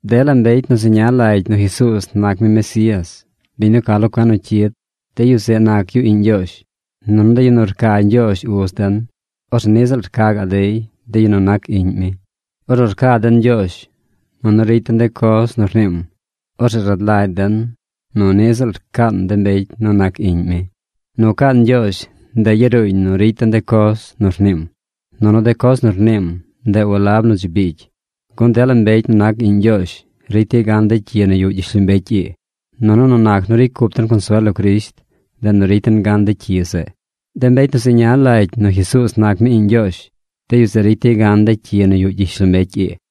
Dela mbecy nu zeña lagy nu Jesuuz nac mi Mesías, biñ nu ca lo cuen nu cyid, de yu zeꞌ nac yu iꞌñ Ñgyoozh. Nunu de yu nu rca Ñgyoozh Uz den, orzeꞌ niꞌ ziꞌl rca gaꞌ dey de yu nu nac iꞌñ mi. Ornu rca den Ñgyoozh, nunu ricy den de coz nu rniim, orzeꞌ rad lagy den nu niꞌ ziꞌl rcaan de mbecy nu nac iꞌñ mi. Nu caan Ñgyoozh, ndeꞌ yaruuñ nu ricy den de coz nu rniim. Nunu de coz nu rniim, ndeꞌ walab nu dzi biigy, gun dela mbecy nu nac iꞌñ Ñgyoozh ricy dey gan de cyi nu yuꞌ gyishlombecy ii. Nunu nu nac nu ricy cup den consuel lo Crisht, ndeꞌ nu ricy den gan de cyi zeꞌ. De mbecy nu zeña lagy nu Jesuuz nac mi Iꞌñ Ñgyoozh, de yu zeꞌ ricy dey gan de cyi nu yuꞌ gyishlombecy ii.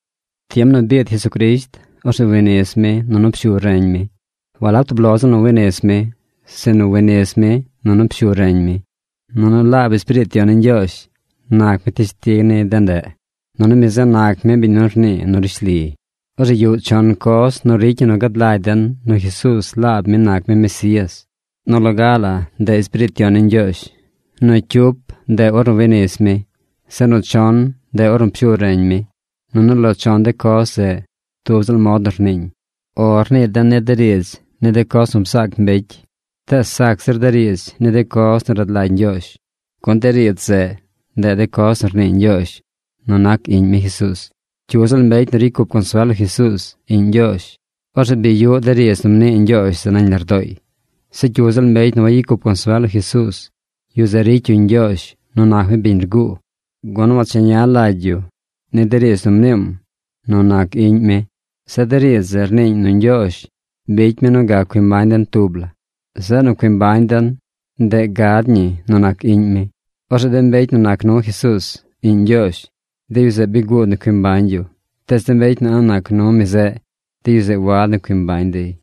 Tiem nu biid Jesucrisht, orzeꞌ wi nis mi nunu pshu reñ mi. Walab tub lo ziꞌl nu wi nis mi, sinu wi nis mi nunu pshu reñ mi. Nunu laab Espiriit Yon ni Ñgyoozh nac mi teshtig ni de ndeꞌ. Nunu mi zeꞌ nac mi biñ nu rnii nu rishli. Orzeꞌ yuꞌ chon coz nu ricy ñi nu gad lagy den nu Jesuuz laab mi nac mi Mesías: nu loga la ndeꞌ Espiriit Yon ni Ñgyoozh, nu cyup ndeꞌ ornu wi nis mi, zeꞌ nu chon, ndeꞌ ornu pshu reñ mi. Nunu lo chon de coz zeꞌ tub ziꞌl mod nu rniiñ. “O” rnii den ni de riidz ni de coz nu bzaac mbecy. Tees sac zir de riidz ni de coz nu rad lagy Ñgyoozh, gun de riidz zeꞌ, ndeꞌ de coz nu rnii Ñgyoozh nu nac Iꞌñ mi Jesuuz. Cyu ziꞌl mbecy nu ricy cup consuel lo Jesuuz, Iꞌñ Ñgyoozh, orzeꞌ bi yuꞌ de riidz nu mnii Ñgyoozh zeꞌ nañ lardooy. Zeꞌ cyu ziꞌl mbecy nu wagyicy cup consuel lo Jesuuz, yu zeꞌ ricy yu Ñgyoozh nu nac mi biñ rguu, gun wancheña lagy yu ni de riidz nu mniim nu nac Iꞌñ mi. Zeꞌ de riidz zeꞌ rniiñ nu Ñgyoozh bicy mi nu gac cui mbañ den tub la. Zeꞌ nu cui mbañ den, ndeꞌ gad ñi nu nac Iꞌñ mi. Orzeꞌ de mbecy nu nac nu Jesuuz, Iꞌñ Ñgyoozh, de yu zeꞌ bi guud nu cui mbañ yu. Tees de mbecy nu a̱ꞌ nac nu mi zeꞌ, de yu zeꞌ wad nu cui mbañ dey.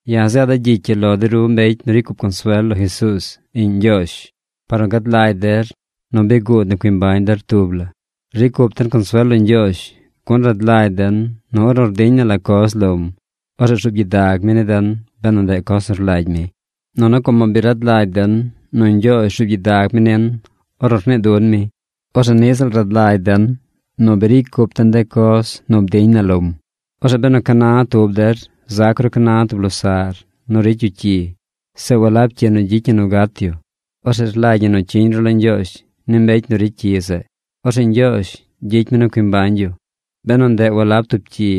Ya̱ zeeda̱ gyicy ii lo de ru mbecy nu ricy cup consuel lo Jesuuz, Iꞌñ Ñgyoozh, par nu gad lagy der nu bi guud nu cui mbañ der tub la. Ricy cup den consuel lo Ñgyoozh, gun rad lagy den nu ornu rdiñ na la coz lom, orzeꞌ rzuub gyidag mi ni den benu ndeꞌ coz nu rlagy mi. Nunu como bi rad lagy den nu Ñgyoozh rzuub gyidag mi nin ornu rnii dun mi, orzeꞌ niꞌ ziꞌl rad lagy den nu bi ricy cup den de coz nu bdiñ na lom. Orzeꞌ benu ca na tub der zac ru ca na tub losaꞌr nu ricy yu cyi, zeꞌ walab cyi nu gyicy ñi nu gat yu, orzeꞌ rlagy ñi nu cyiñ ru lo Ñgyoozh ni mbecy nu ricy cyi zeꞌ. Orzeꞌ Ñgyoozh gyicy mi nu cui mbañ yu, benu ndeꞌ walab tub cyi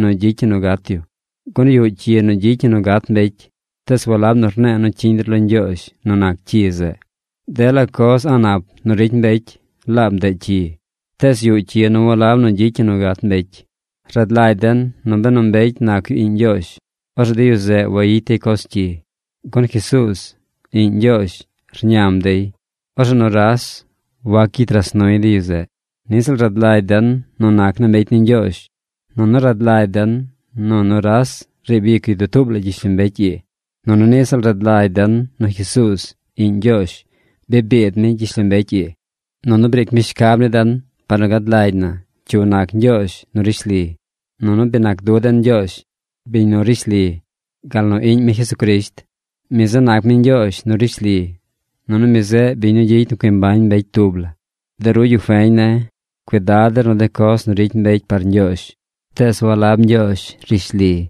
nu gyicy ñi nu gat yu. Gun yuꞌ cyi nu gyicy ñi nu gat mbecy. Tees walab nu rne̱e̱ nu cyiñ der lo Ñgyoozh nu nac cyi zeꞌ. Dela coz a̱ꞌ nap nu ricy mbecy laab ndeꞌ cyi. Tees yuꞌ cyi nu walab nu gyicy ñi nu gat mbecy. Rad lagy den nu benu mbecy nac yu iꞌñ Ñgyoozh, orzeꞌ de yu zeꞌ wayicy dey coz cyi. Gun Jesuuz, Iꞌñ Ñgyoozh, rñam dey. Orzeꞌ nuras wac gyicy ras nuy de yu zeꞌ. Niꞌ ziꞌl rad lagy den nu nac naa mbecy ni Ñgyoozh. Nunu rad lagy den nu nuras riib ic yu dutuub la gyishlombecy ii. Nunu niꞌ ziꞌl rad lagy den nu Jesuuz, Iꞌñ Ñgyoozh, bi biid mi gyishlombecy ii, nunu briic mi shcab ni den par nu gad lagy na cyu nac Ñgyoozh nu rishli. Nunu bi nac du den Ñgyoozh, biñ nu rishli, gal nu Iꞌñ mi Jesucrisht. Mi zeꞌ nac mi Ñgyoozh nu rishli. Nunu mi zeꞌ biñ nu gyicy nu cui mbañ mbecy tub la. De ru yu feñ ne̱, cuidad der nu de coz nu ricy mbecy par ñgyoozh, tees walab ñgyoozh rishli.